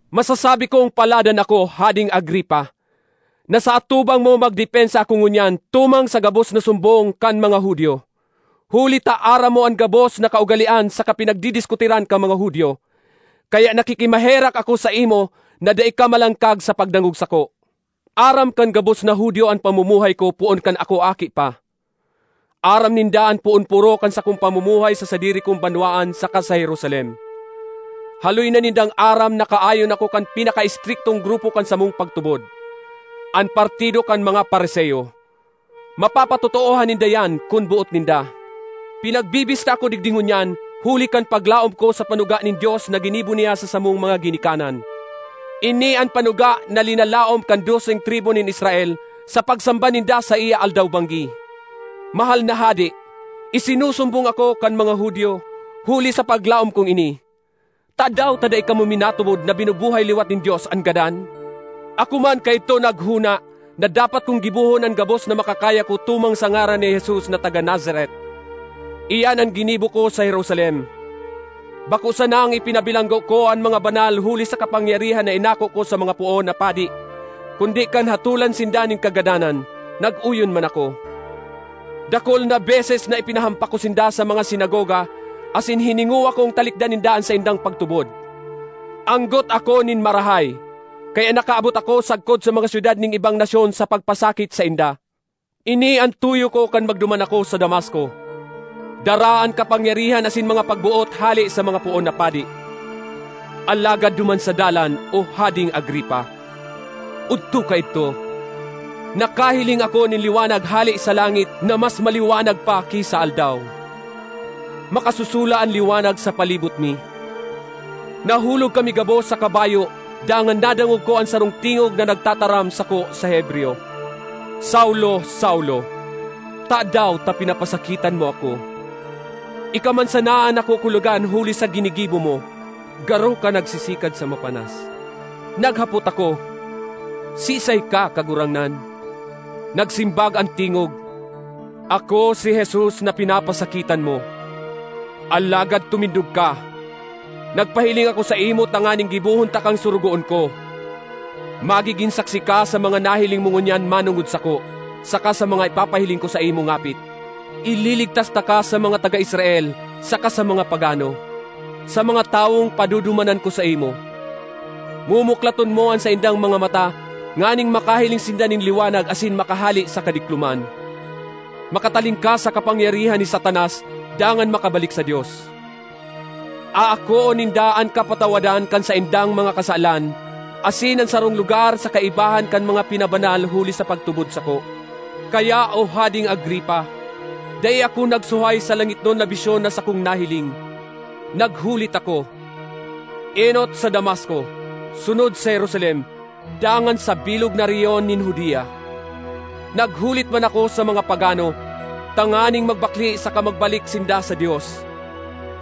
”Masasabi kong paladan ako, Hadeng Agripa, na sa atubang mo magdepensa ako ngunyan tumang sa gabos na sumbong kan mga Judio, huli ta aram mo an gabos na kaugalean saka pinagdidiskutiran kan mga Judio. Kaya nakikimaherak ako saimo na dai ka malangkag sa pagdangog sako. ”Aram kan gabos na Judio an pamumuhay ko poon kan ako aki pa. Aram ninda an poon-poro kan sakong pamumuhay sa sadiri kong banwaan saka sa Jerusalem. Haloy na nindang aram na kaayon ako kan pinakaestriktong grupo kan samong pagtubod—an partido kan mga Fariseo. Mapapatotoohan ninda iyan kun boot ninda. Pinagbibista ako digdi ngunyan huli kan paglaom ko sa panuga nin Dios na ginibo niya sa samong mga ginikanan. Ini an panuga na linalaom kan doseng tribu nin Israel sa pagsamba ninda saiya aldaw-banggi. Mahal na hade, isinusumbong ako kan mga Judio huli sa paglaom kong ini. Tadaw ta dai kamo minatubod na binubuhay liwat nin Dios an gadan? ”Ako man kaidto naghona na dapat kong gibohon an gabos na makakaya ko tumang sa ngaran ni Jesus na taga Nazaret. Iyan an ginibo ko sa Jerusalem; bako sanang ipinabilanggo ko an mga banal huli sa kapangyarihan na inako ko sa mga poon na padi kundi kan hatolan sinda nin kagadanan, nag-oyon man ako. Dakul na beses na ipinahampak ko sinda sa mga sinagoga asin hiningowa kong talikdan ninda an saindang pagtubod. Anggot ako nin marahay, kaya nakaabot ako sagkod sa mga syudad nin ibang nasyon sa pagpasakit sainda. ”Ini an tuyo ko kan magduman ako sa Damasco, dara an kapangyarihan asin mga pagboot hale sa mga poon na padi. Alagad duman sa dalan, O Hadeng Agripa, odto kaidto, nakahiling ako nin liwanag hale sa langit na mas maliwanag pa ki sa aldaw. Makasusula an liwanag sa palibot mi. Nahulog kami gabos sa kabayo dangan nadangog ko an sarong tingog na nagtataram sako sa Hebreyo, ‘Saulo, Saulo, tadaw ta pinapasakitan mo ako? Ika man sana an nakukulogan huli sa ginigibo mo. Garo ka nagsisikad sa mapanas.’ Naghapot ako, ‘Siisay ka, Kagurangnan?’ Nagsimbag an tingog, ‘Ako si Jesus, na pinapapasakitan mo. Alagad tumindog ka! Nagpahiling ako saimo tanganing gibohon takang sorogoon ko; magigin saksi ka sa mga nahiling mo ngunyan manongod sako saka sa mga ipapahiling ko saimo ngapit. Ililigtas taka sa mga taga Israel saka sa mga pagano, sa mga tawong padudumanan ko saimo. Mumuklaton mo an saindang mga mata nganing makahiling sinda nin liwanag asin makahale sa kadikloman; makatalingkas sa kapangyarihan ni Satanas dangan makabalik sa Dios. Aakoon ninda an kapatawadan kan saindang mga kasalan asin an sarong lugar sa kaibahan kan mga pinabanal huli sa pagtubod sako.’ ”Kaya, O Hadeng Agripa, dai ako nagsuhay sa langitnon na bisyon na sakong nahiling. Naghulit ako, enot sa Damasco, sunod sa Jerusalem dangan sa bilog na rehiyon nin Judea. Naghulit man ako sa mga pagano, tanganing magbakle saka magbalik sinda sa Dios,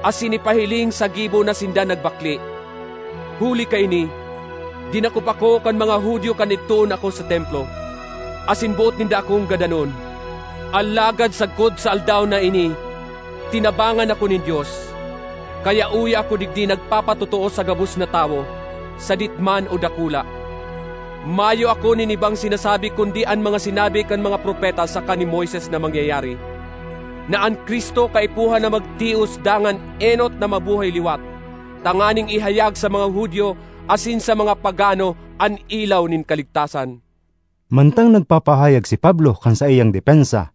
asin ipahiling sa gibo na sinda nagbakle. Huli kaini dinakop ako kan mga Judio kan idtoon ako sa Templo, asin boot ninda akong gadanon. Alagad sagkod sa aldaw na ini tinabangan ako nin Dios, kaya uya ako digdi nagpapatotoo sa gabos na tawo—sadit man o dakula. Mayo ako nin ibang sinasabi kundi an mga sinabi kan mga propeta saka ni Moises na mangyayari: na an Cristo kaipuhan na magtios dangan enot na mabuhay liwat, tanganing ihayag sa mga Judio asin sa mga pagano an ilaw nin kaligtasan.” Mantang nagpapahayag si Pablo kan saiyang depensa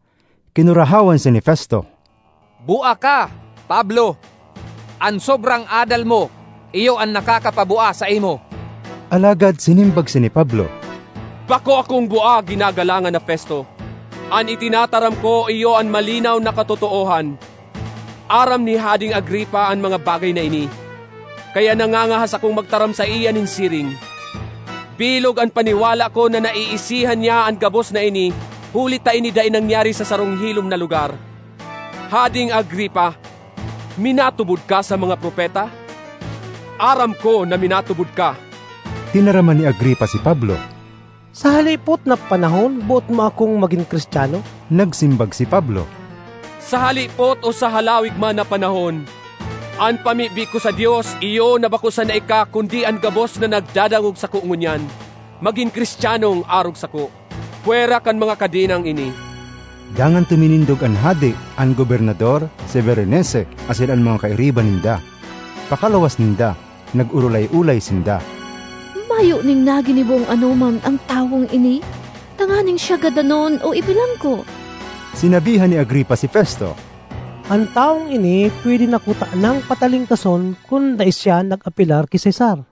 kinurahawan siya ni Festo, “Bua ka, Pablo! An sobrang adal mo iyo an nakakapabua saimo!” Alagad sinimbag siya ni Pablo, “Bako akong bua ginagalangan na Festo. An itinataram ko iyo an malinaw na katotoohan. Aram ni Hadeng Agripa an mga bagay na ini, kaya nangangahas akong magtaram saiya nin siring. Bilog an paniwala ko na naiisihan niya an gabos na ini huli ta ini dai nangyari sa sarong hilom na lugar. Hadeng Agripa, minatubod ka sa mga propeta? Aram ko na minatubod ka!” Tinaraman ni Agripa si Pablo, “Sa halipot na panahon boot mo akong magin Cristiano!” Nagsimbag si Pablo, “Sa halipot o sa halawig man na panahon, an pamibi ko sa Dios iyo na bako sana ika kundi an gabos na nagdadangog sako ngunyan magin Cristianong arog sako—pwera kan mga kadenang ini!” Dangan tuminindog an hade, an gobernador, si Berenice asin an mga kairiba ninda. Pakaluwas ninda, nag-orolay-olay sinda, “Mayo nin naginibong anoman an tawong ini tanganing siya gadanon o ibilanggo.” Sinabihan ni Agripa si Festo, “An tawong ini pwede na kutanang patalingkason kun dai siya nag-apelar ki Cesar.”